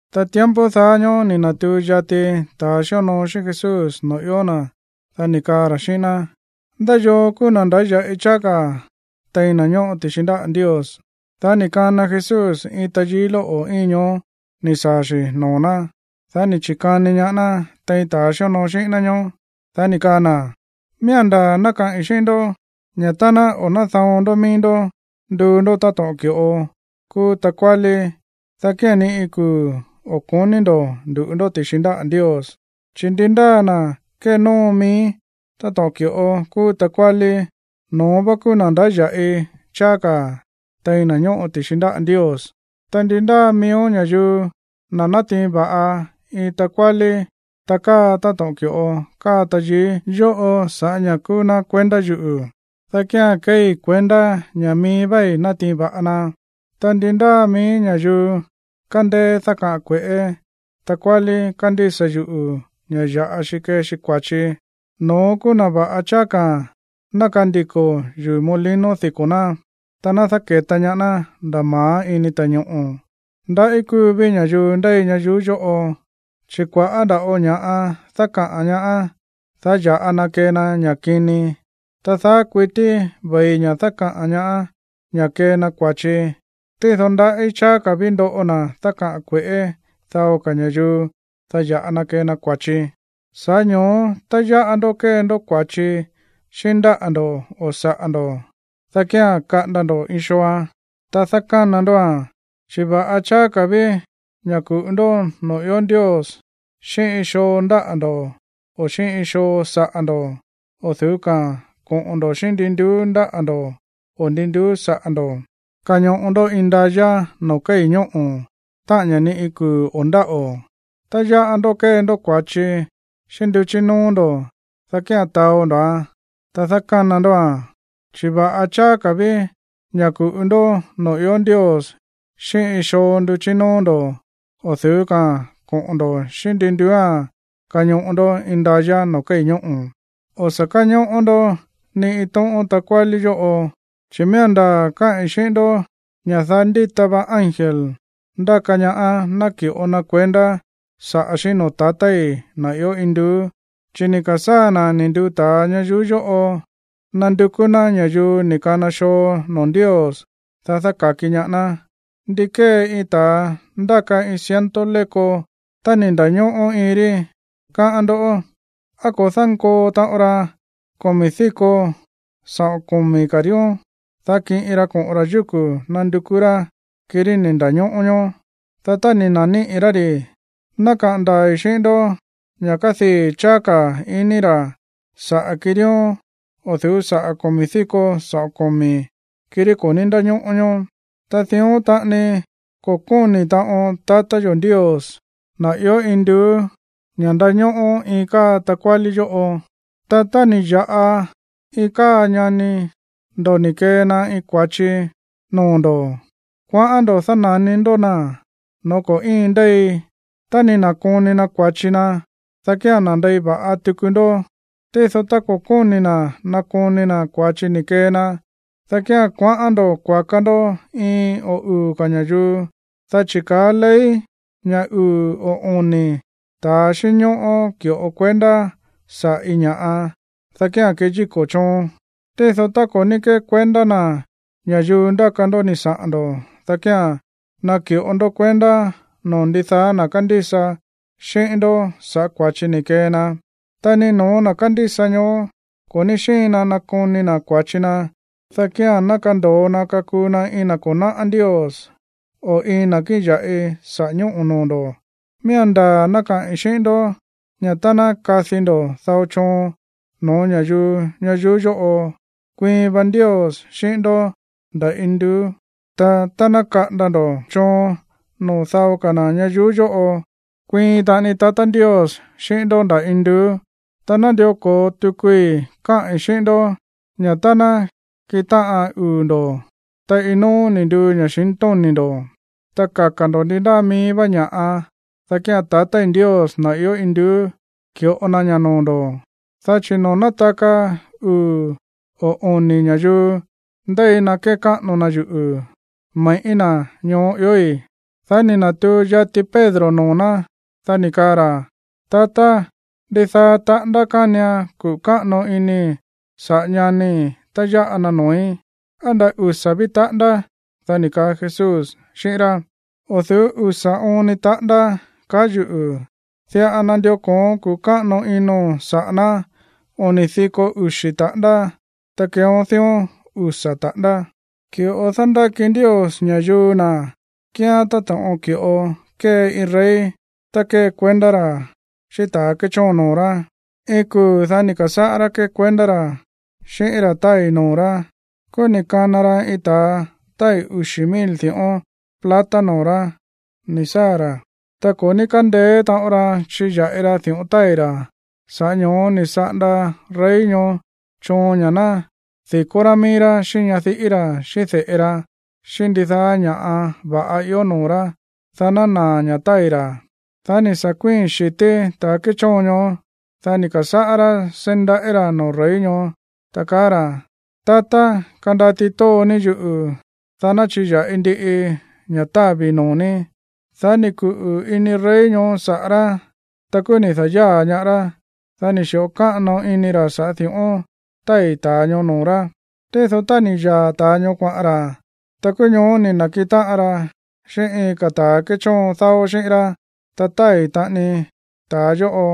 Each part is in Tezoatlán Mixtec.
Ta tiempo daá ñóó ni̱ na̱tuu yati ta̱ xíonoo xíꞌín Jesús noo̱ ió na̱, dá ni̱ kaa ra̱ xíꞌín ná: ―¿Ndá yoo kúú na̱ ndáya̱ꞌi cháá ka̱ tein na̱ ñóꞌo ti̱xi ndáꞌa̱ Ndios? Dá ni̱ kana Jesús iin tayií lóꞌo̱ íin ñoó ni̱ saa̱ xi̱ noo̱ ná. Dá ni̱ chi̱kani ñaá ná tein ta̱a xíonoo xíꞌín ná ñóó. Dá ni̱ kaa na̱: ―Miía̱n ndaa̱ ná kaꞌi̱n xíꞌín ndó ña̱ tá ná o̱ náda̱on ndó mií ndó nduu ndó táto̱ꞌon ki̱ꞌo kúú takuálí, dá kía̱n ni iin kuu̱ o̱ ko̱ní ndo̱ ndu̱ꞌu ndó ti̱xi ndáꞌa̱ Ndios. Chi̱ ndi ndáa na̱ kénóo mií táto̱ꞌon ki̱ꞌo kúú takuálí, no̱ón vá kúú na̱ ndáya̱ꞌi cháá ka̱ tein na̱ ñóꞌo ti̱xi ndáꞌa̱ Ndios. Ta ndi ndáa miíó ña̱yuu ná natiin va̱ꞌa iin takuálí ta káa táto̱ꞌon ki̱ꞌo káa tayií yóꞌo sa̱ꞌá ña̱ kúú ná kuendá yuꞌu̱, dá kía̱n keei kuendá ña̱ mií váí ni̱ na̱tiin va̱ꞌa na. ’Ta ndi ndáa mií ña̱yuu kándéé dákaꞌa̱n kue̱ꞌé takuálí kándísa yuꞌu̱ ña̱ ya̱ꞌa xi kee xi kua̱chi, no̱ón kúú na̱ va̱ꞌa cháá ka̱ ná kandiko̱ yuu̱ molino diko̱ ná, ta ná dáke̱ta ñaá ná nda̱ ma̱á ini ta̱ñoꞌo̱. ¡Ndaꞌí kúu ví ña̱yuu ndéi ñayuú yóꞌo, chi̱ kua̱ꞌá nda̱ꞌo ña̱ꞌa dákaꞌa̱n ñaá, dá ya̱ꞌa na kee na ña̱ kini! Ta daá kuití ve̱i ña̱ dákaꞌa̱n ñaá ña̱ kee na kua̱chi. Tído ¡ndaꞌí cháá ka̱ ví ndoꞌo na̱ dákaꞌa̱n kue̱ꞌé dao ka̱ ña̱yuu, dá ya̱ꞌa na kee na kua̱chi! ’Sa̱ꞌá ño̱ó tá yáꞌa ndó kée ndó kua̱chi xíꞌín ndáꞌa̱ ndo̱ o saꞌa̱ ndo̱, dá kía̱n kaꞌanda ndo̱ iin xooa̱n, ta dákána ndóa̱n. Chi̱ va̱ꞌa cháá ka̱ ví ña̱ ku̱ꞌu ndó noo̱ ió Ndios xíꞌín iin xoo ndáꞌa̱ ndo̱ o xíꞌín iin xoo saꞌa̱ ndo̱ o̱ du̱ú ka̱a̱n koꞌo̱n ndo̱ xíꞌín ndi nduú ndáꞌa̱ ndo̱ o ndi nduú saꞌa̱ ndo̱ kañoꞌo ndó indayá noo̱ kéi̱ ñóꞌo̱, táꞌa̱n ña̱ ni iin kuu̱ o̱ ndáꞌo̱. Tá yáꞌa ndó kée ndó kua̱chi xíꞌín nduchí nóó ndo̱, dá kía̱n taó ndo̱án, ta dákána ndóa̱n. Chi̱ va̱ꞌa cháá ka̱ ví ña̱ ku̱ꞌu ndó noo̱ ió Ndios xíꞌín iin xoo nduchí nóó ndo̱ o̱ du̱ú ka̱a̱n koꞌo̱n ndo̱ xíꞌín ndi nduúa̱n kañoꞌo ndó indayá noo̱ kéi̱ ñóꞌo̱. ’O̱ sa̱ káñóꞌó ndó ni iin tóꞌón takuálí yóꞌo, chi̱ miía̱n ndaa̱ káꞌi̱n xíꞌín ndó ña̱ daá ndíta va ángel ndáka ñaá náki̱ꞌo na kuendá saꞌa̱ xí noo̱ tatái̱, na̱ ió induú, chi̱ ni̱ ka̱sáa̱ na̱ ni̱ nduu ta̱a ñayuú yóꞌo nandukú ná ña̱yuu ni̱ kana xoo noo̱ Ndios, dá dáka̱ki ñaá ná. ’¿Ndi kée iin ta̱a ndáka iin ciento léko tá ni̱ nda̱ñóꞌó iin rí, káꞌán ndó? ¿Á ko̱ dánkoo taꞌon ra komi̱ díko saꞌo̱n komi̱ ka̱ ríón, dá kiꞌin ra koꞌo̱n ra̱ yúku̱ nandukú rá kirí ni̱ nda̱ñóꞌó ñoó? Dá tá ni̱ na̱níꞌi̱ rá ri̱, ná kaꞌa̱n ndaa̱i̱ xíꞌín ndó ña̱ kádii̱ cháá ka̱ ini ra̱ saꞌa̱ kiríóón o̱ du̱ú sa̱ꞌá komi̱ díko saꞌo̱n komi̱ kirí ko̱ ní ndáñóꞌó ñoó. Ta dión taꞌani ko̱ kóni̱ taꞌon tatá yo̱ Ndios, na̱ ió induú, ña̱ ndañóꞌó iin káa takuálí yóꞌo. ’Ta tá ni̱ ya̱ꞌa iin káa ñani ndo̱ ni̱ kee na iin kua̱chi noo̱ ndo̱, kuaꞌán ndo̱ dána̱ni ndó na̱ no̱ó ko̱ íin ndéi. Tá ni̱ na̱koni na̱ kua̱chi na, dá kía̱n nandei va̱ꞌa tuku ndó. Tído tá ko̱ kóni̱ na̱ nakoni na̱ kua̱chi ni̱ kee na, dá kía̱n kuaꞌán ndo̱ kuaka ndó iin o uu̱ ka̱ ña̱yuu, dá chi̱ kaá ley ña̱ uu̱ o oni̱ ta̱a xínñóꞌó ki̱ꞌo kuendá saꞌa̱ iin ña̱ꞌa, dá kía̱n keyíko̱ choon. Tído tá ko̱ ní kékuendá na̱ ña̱yuu ndáka ndó ni̱ saꞌa̱n ndo̱, dá kía̱n naki̱ꞌo ndó kuendá noo̱ ndidaá na̱ kándísa xíꞌín ndó sa̱ꞌá kua̱chi ni̱ kee na. Tá ni no̱ó na̱ kándísa ñoó ko̱ ní xíin na nakoni na̱ kua̱chi na, dá kía̱n ná kando̱o na kakuu na iin na̱ ko̱ náꞌá Ndios, o iin na̱ kíꞌin ya̱ꞌi saꞌa̱ ñóꞌo̱ noo̱ ndo̱. ’Miía̱n ndaa̱ ná kaꞌi̱n xíꞌín ndó ña̱ tá ná kadi ndo̱ dao choon no̱ó ña̱yuu ñayuú yóꞌo, kuiin va Ndios xíꞌín ndó nda̱ induú. Ta tá ná kaꞌanda ndo̱ choon noo̱ dao ka̱ na̱ ñayuú yóꞌo, kuiin taꞌani Ndios xíꞌín ndó nda̱ induú. Ta nándió ko̱o tukui káꞌi̱n xíꞌín ndó ña̱ tá nákiꞌin táꞌan uu̱ ndo̱, ta iin no̱ó ni̱ nduu ña̱xintóni̱ ndo̱, ta kaka̱ ndo̱ ndi ndáa mií vá ña̱ꞌa, dá kía̱n tatái̱ Ndios, na̱ ió induú, ki̱ꞌo na ña̱ noo̱ ndo̱. Dá chi̱ noo̱ nátaka uu̱ o oni̱ ña̱yuu ndéi na kékáꞌano na yuꞌu̱, me̱ꞌí na̱ ñoó iói̱. Dá ni̱ na̱tuu yati Pedro noo̱ ná, dá ni̱ kaa ra̱: ―Tatá, ¿ndidaá taꞌándá kánian kuꞌu̱ káꞌano inii̱ saꞌa̱ ñanii̱ tá yáꞌa na noo̱í? ¿Á nda̱ usa̱ ví taꞌándá? Dá ni̱ kaa Jesús xíꞌín rá: ―O̱ du̱ú usa̱ oon ni taꞌándá, kaá yuꞌu̱. Diꞌa nandió ko̱oón kuꞌu̱ káꞌano ino̱n saꞌa̱ ná oni̱ diko uxi̱ taꞌándá. Ta keeón dión usa̱ taꞌándá. ’Ki̱ꞌo dándáki Ndios ña̱yuu na̱ kíán táto̱ꞌon ki̱ꞌo kée iin rey tá ndékuendá ra̱ xíꞌín ta̱ kéchóon noo̱ rá. Iin kuu̱, dá ni̱ ka̱sáꞌá rá ndékuendá ra̱ xíꞌín ra̱ tái̱ noo̱ rá. Kúú ni̱ kana ra iin ta̱a tái̱ uxi̱ mil di̱ꞌón plata noo̱ rá ni̱ saa̱ ra̱. Ta ko̱ ní kándeé taꞌon ra chiya̱ꞌi ra di̱ꞌón tái̱ ra̱. Sa̱ꞌá ño̱ó ni̱ saꞌanda rey ñoó choon ña̱ ná di̱kó rá mií rá xíꞌín ñadiꞌí ra̱, xíꞌín de̱ꞌe ra, xíꞌín ndidaá ña̱ va̱ꞌa ió noo̱ rá, dá ná naa̱ ña̱ tái̱ ra̱. Dá ni̱ sa̱ kuíi̱n xi̱tí ta̱ kéchóon ñoó, dá ni̱ ka̱sáꞌá rá seí ndaꞌí ra̱ noo̱ rey ñoó, ta kaá ra̱: “Tatá, kandati tóo ní yuꞌu̱, dá ná chiya̱ꞌi ndiꞌii ña̱ távi̱ noo̱ ní.” Dá ni̱ kuꞌu̱ ini rey ñoó saꞌa̱ rá. Ta kúú ni̱ da̱yáa̱ ñaá rá, dá ni̱ xi̱ꞌo káꞌano ini ra̱ sa̱ꞌá di̱ꞌón tái̱ ta̱a ñoó noo̱ rá. ’Tído tá ni̱ yaa̱ ta̱ ñoó kuaꞌa̱n ra̱, ta kúú ñoó ni̱ na̱kiꞌin táꞌan ra xíꞌín iin ka̱ ta̱ kéchóon dáó xíꞌín rá, ta tái̱ ta̱a yóꞌo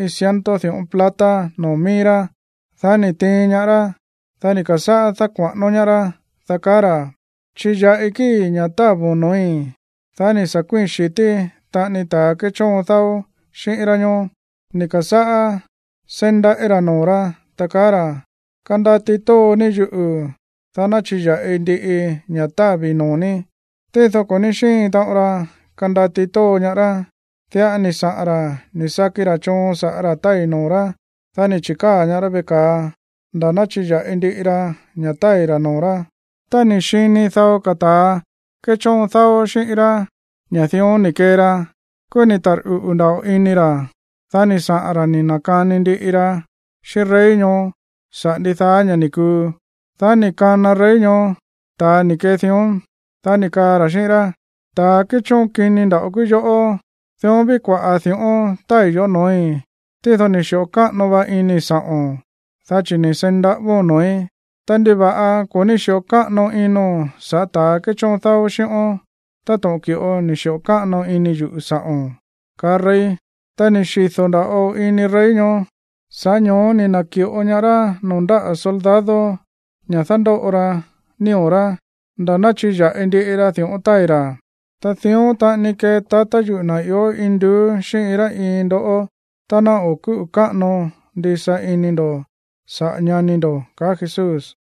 iin ciento di̱ꞌón plata noo̱ mií rá. Dá ni̱ tiin ñaá rá, dá ni̱ ka̱sáꞌá dákua̱ꞌánó ñaá rá, dá kaá ra̱: “Chiya̱ꞌi kíi̱ ña̱ távo̱n noo̱í.” Dá ni̱ sa̱ kuíi̱n xi̱tí taꞌani ta̱a kéchóon dáó xíꞌín rá ñóó, ni̱ ka̱sáꞌá seí ndaꞌí ra̱ noo̱ rá, ta kaá ra̱: “Kandati tóo ní yuꞌu̱, dá ná chiya̱ꞌi ndiꞌii ña̱ távi̱ noo̱ ní.” Tído ko̱ ní xíin taꞌon ra kandati tóo ñaá rá. Diꞌa ni̱ saꞌa̱n ra̱ ni̱ saki ra̱ choon sa̱ꞌá ra̱ tái̱ noo̱ rá, dá ni̱ chi̱káa̱ ñaá rá veꞌe ka̱a nda̱ ná chiya̱ꞌi ndiꞌi ra ña̱ tái̱ ra̱ noo̱ rá. Tá ni̱ xini dao ka̱ ta̱ kéchóon dáó xíꞌín rá ña̱ dión ni̱ kee ra, kúú ni̱ tarꞌuꞌu̱ nda̱ꞌo ini ra̱. Dá ni̱ saꞌa̱n ra̱ ni̱ na̱kani ndiꞌi ra xíꞌín rey ñoó saꞌa̱ ndidaá ña̱ ni̱ kuu. Dá ni̱ kana rey ñoó ta̱a ni̱ kee dión. Dá ni̱ kaa ra̱ xíꞌín rá: “Ta̱ kéchóon kini nda̱ꞌo kúú yoꞌó. Dión ví kua̱ꞌá di̱ꞌón tái̱ yoꞌó no̱ói̱, tído ni̱ xi̱ꞌo káꞌano va inii̱ sa̱ꞌo̱n, dá chi̱ ni̱ seí ndaꞌávóo̱n noo̱í. Ta, ¿ndiva̱ꞌa ko̱ ní xi̱ꞌo káꞌano ino̱n sa̱ꞌá ta̱ kéchóon dáó xíꞌón táto̱ꞌon ki̱ꞌo ni̱ xi̱ꞌo káꞌano ini yuꞌu̱ sa̱ꞌo̱n?”, kaá rey. Ta ni̱ xido̱ nda̱ꞌo ini rey ñoó. Sa̱ꞌá ño̱ó ni̱ na̱ki̱ꞌo ñaá rá noo̱ ndáꞌa̱ soldado ña̱ dándóꞌo ra nío̱ rá nda̱ ná chiya̱ꞌi ndiꞌi ra di̱ꞌón tái̱ ra̱. Ta dión taꞌani kee tatá yuꞌu̱, na̱ ió induú, xíꞌín iin rá iin ndoꞌó tá ná o̱ kúꞌu̱ káꞌano ndisa ini ndo̱ saꞌa̱ ñani ndo̱ ―kaá Jesús.